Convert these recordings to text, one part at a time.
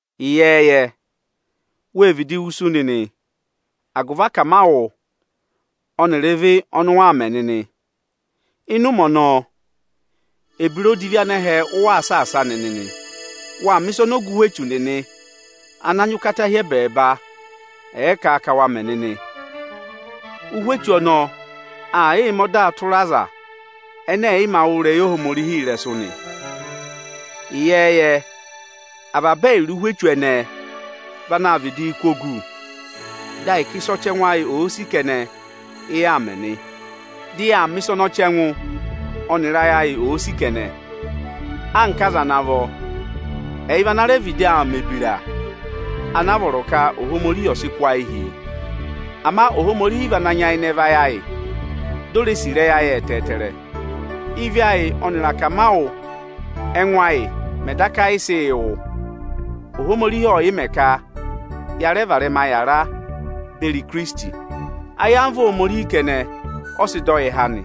Ịyẹẹyẹ, wê vịdị wusu nịnị agụvị akamawụ ọnịrị ịvị ọnị ụ waa mẹ nịnị. Ịnị ụmẹ ọnọọ, ebira odivi anẹhẹ ụ waa saasa nịnị nị. Waa mẹ̀ ịsa ọnị ọga ụhwẹ echu nịnị ana nyị ụkata hi ẹbẹẹba ẹ̀ẹ kà ka wa mẹ nịnị. Ụhwẹ echu ọnọọ aa yịị mẹ ọda tụra aza ẹnẹ ẹ̀ yị mā wụ́ ịrẹyị Ohomorihi ịrẹsụ nị. Ịyẹẹyẹ avaba ẹyịrị ụhwẹ echu ẹnẹẹ vị anaā vịdịị kụ́ ogu, dị ahịka oyisì ẹngụ ẹyị ọza kẹnẹ, ị yaa mẹ nị. Dị yaa mẹ̀ ịsa ọnị ọchẹngụ ọnịrị ayị ayị òo sì kẹnẹ; anka aza ana vọ, ẹyị vị ana rẹ vịdị aa mẹ̀ ebira anaa vọrọ ka Ohomorihi ọ̀ sị kụ́ ayị hi yị. Ama Ohomorihi vị ana nyayịnẹ vayị ayị, di o re sì ịrẹyị ayị ẹtẹẹtẹrẹ. Ị́vị ayị ọnịrị akamawụ ẹngụ ayị mẹ̀ daka yị sị yị wụ, Ohomorihi ọ yị mẹ ka ya varẹma yàra beri Ikirisiti. Ayamva Ohomorihi kẹnẹ ọ sị dọ yị há nị.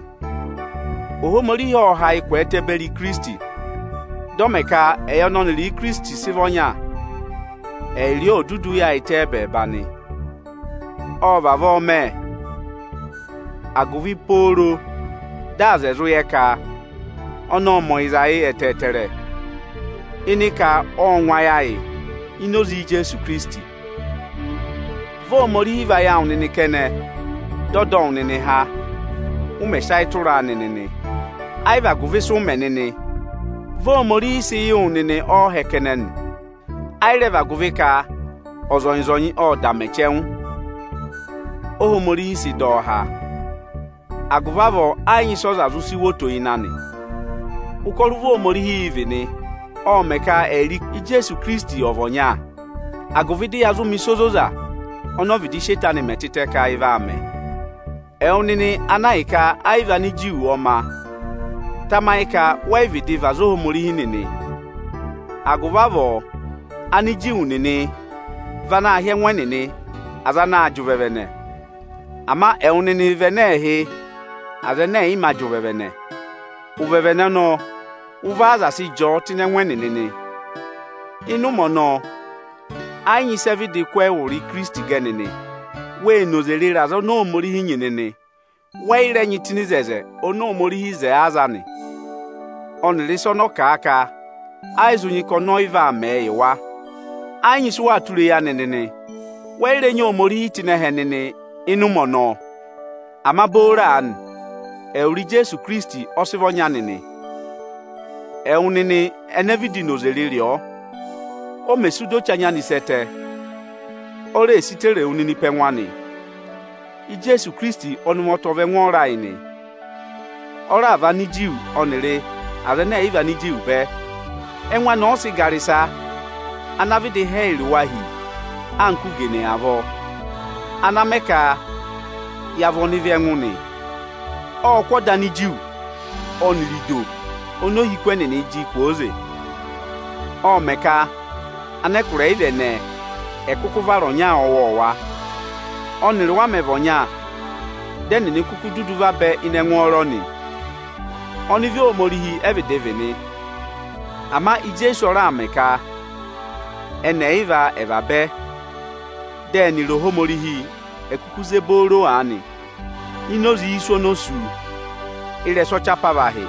Ohomorihi ộ ha yị kwẹẹtẹ beri Ikirisiti, dị ọ mẹ ka ẹyị ọnị ọnịrị Ikirisiti sị vị ọnya, ẹyịrị ọọ ò dudu yaayịtẹ ẹ́bẹẹba nị. Ọ vavọọ mẹ, agụvị pooro dị aza ẹ̀ zụ yẹ ka ọnị ọ́ọ mẹ ọyịza yị ẹtẹẹtẹrẹ, ịnị ka ọ́ọ ngụ ayị ayị ini oze Ijeesu Ikirisiti. Vị Ohomorihi vayị awụ nịnị kẹnẹ, dị ọ dọ wụ nịnị há, ụ mẹ̀ sị ayị tụraa nịnị nị. Ayị vị agụvị ịsị ụ mẹ nịnị, vị Ohomorihi sị yị wụ nịnị ọọhẹ kẹnẹ nị. Ayị rẹ vị agụvị ka ọzọnyị-ọzọnyị ọ́ọ da mẹ chẹngụ, Óhomorihi sị dọ ọ há. Agụvị avọọ ẹ yị nyị ịsị ọza zụ sị wo oto ịnị anị. Ụkọrọ ụvọ Ohomorihi ị vị nị, ộ mẹ̀ ka ẹyịrị Ijeesu Ikirisiti ọ̀ vị ọnya, agụvị dị yaa zụụ mẹ̀ ịsa ozoza ọnị ọ vịdị sị eto anị mẹ tịtẹ ka ị vaa mẹ. Ẹwụ nịnị ana ahịka ayị vị Aniju ọ ma, tamayị ka wẹ yị vịdị vị aza Ohomorihi nịnị! Agụvị avọọ Aniju nịnị vị anaā hị́ ẹngụ ẹnịnị aza anaā jị ụvẹvẹnẹ; ama ẹwụ nịnị vị ẹnẹ ẹẹ̄ hị́ aza ẹnẹ ẹ̀ yị mā jị ụvẹvẹnẹ. Ụvẹvẹnẹ ọnọọ, ụvọ aza sị jị ọ tụ́ ịnị ẹngụ ẹnịnị nị. Ịnị ụmẹ ọnọọ, ẹ yị nyị ịsị ẹ vịdị kụ́ ẹwụrị Ikirisiti gẹ nịnị. Wê noze rịrị aza oni Ohomorihi nyị nịnị. Wẹ yị rẹ nyị tụ́ ịnị oto oni Ohomorihi wo yị aza anị, ọnịrị ịsa ọnị ọ kà a ka ẹ yị zụ nyị ka ọnị ọyị vaa mẹẹ yị wa. Ẹ yị nyị ịsị ụ waa tụra eyi anị nịnị; wẹ yị rẹ nyị Ohomorihi tụ́ ịnị ẹhẹ nịnị ịnị ụmẹ ọnọọ. Ama booro aanị, ẹwụrị Ijeesu Ikirisiti ọ sị vị ọnya nịnị. Ẹwụ nịnị ene vịdị noze rịrị ọọ, o mè sú di o che anya anị sẹ́ ẹtẹ, o reè si tere wu nịnị pe ẹngụ anị. Ijeesu Ikirisiti ọnị ụvọta ọ vị ẹngwọọrọ ayị nị. Ọ raà và Aniju ọnịrị aza ẹnẹ ẹ̀yị vị Aniju bẹ. Ẹngụ anị ọ sị gara ịsa ana vịdị há ẹyịrị wa hi anka ugene avọọ, ana mẹ ka ya vị ọnịvị ẹngụ nị. Ộ kụ́ ọda Aniju ọnịrị ido oni ohiku ẹnịnị jị kwooze. Ộ mẹ ka anẹkụra ẹyịva ẹnẹẹ ẹ̀ kụkụ vara aza ọwọọwa ọnyara, ọ́nịrị wa mẹ̀ vị ọnya. Dị ẹnịnị kuku dudu vabẹ ịnị ẹngwọọrọ nị. Ọnịvị Ohomorihi ẹ vịdị vị nị, ama Ijeesu ọ raà mẹ ka ẹnị ẹyịva ẹ̀ vabẹ, dị ẹnịrị Ohomorihi è kuku ze booro aanị ini oze isu oni o sú ị́rẹsụ ọchị apavahị.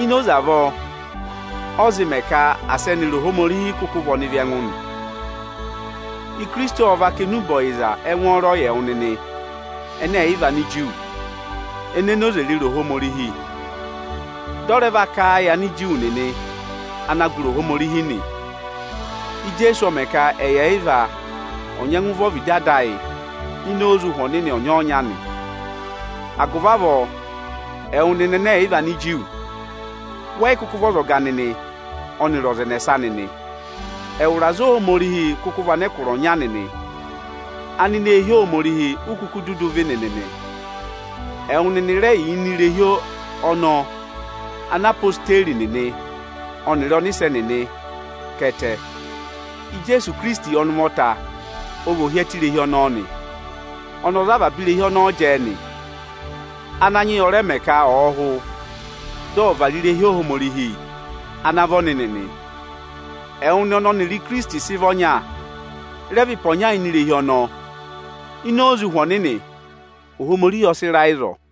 Ini oze avọọ ọ zị mẹ ka asị ẹnịrị Ohomorihi kụkụ vị ọnịvị ẹngụ nị. Ikirisiti ọ va kà enube ọyịza ẹngwọọrọ yị ẹwụ nịnị (ẹnẹ ẹ̀yị vị Aniju) ene noze rịrị Ohomorihi. Dị ọ rẹ va kà a yị Aniju nịnị ana gụrị Ohomorihi nị. Ijeesu ọ mẹ ka ẹyị ẹyịva ọ̀ nyẹngụ vẹ ọvịdị Ada ayị ini oze Ụhwẹ Ọnịnị ọnyọọnya nị. Agụvị avọọ, ẹwụ nịnị ẹnẹ ẹ̀ yị vị Aniju, wẹ yị kụkụ vị ọzọga ọnịrị ọza ẹnẹsa nịnị. Ẹwụrị aza Ohomorihi kụkụ vị anẹkụra ọnya nịnị, anineehi Ohomorihi u kuku dudu vị nịnị nị. Ẹwụ nịnị rẹ yà ini irehi ọnọọ ana odeyi nịnị ọnịrị ọnịsẹ nịnị ká ẹtẹ. Ijeesu Ikirisiti ọnị ụvọta ọ vị ohyẹtẹ irehi ọnọọ nị. Ọnị ọ za avaba irehi ọnọọ jẹẹ nị; Ananyị yị ọ rẹ mẹ ka ọ̀ọ hụ, dị ọ̀ vara irehi Ohomorihi ana vị ọnịnị nị. Ẹwụ nịnị ọnị ọnịrị Ikirisiti sị vị ọnya, rẹ vị ịpa ọnya ini irehi ọnọọ. Ini oze Ụhwẹ Ọnịnị, Ohomorihi ọ sị ra ịzọọ.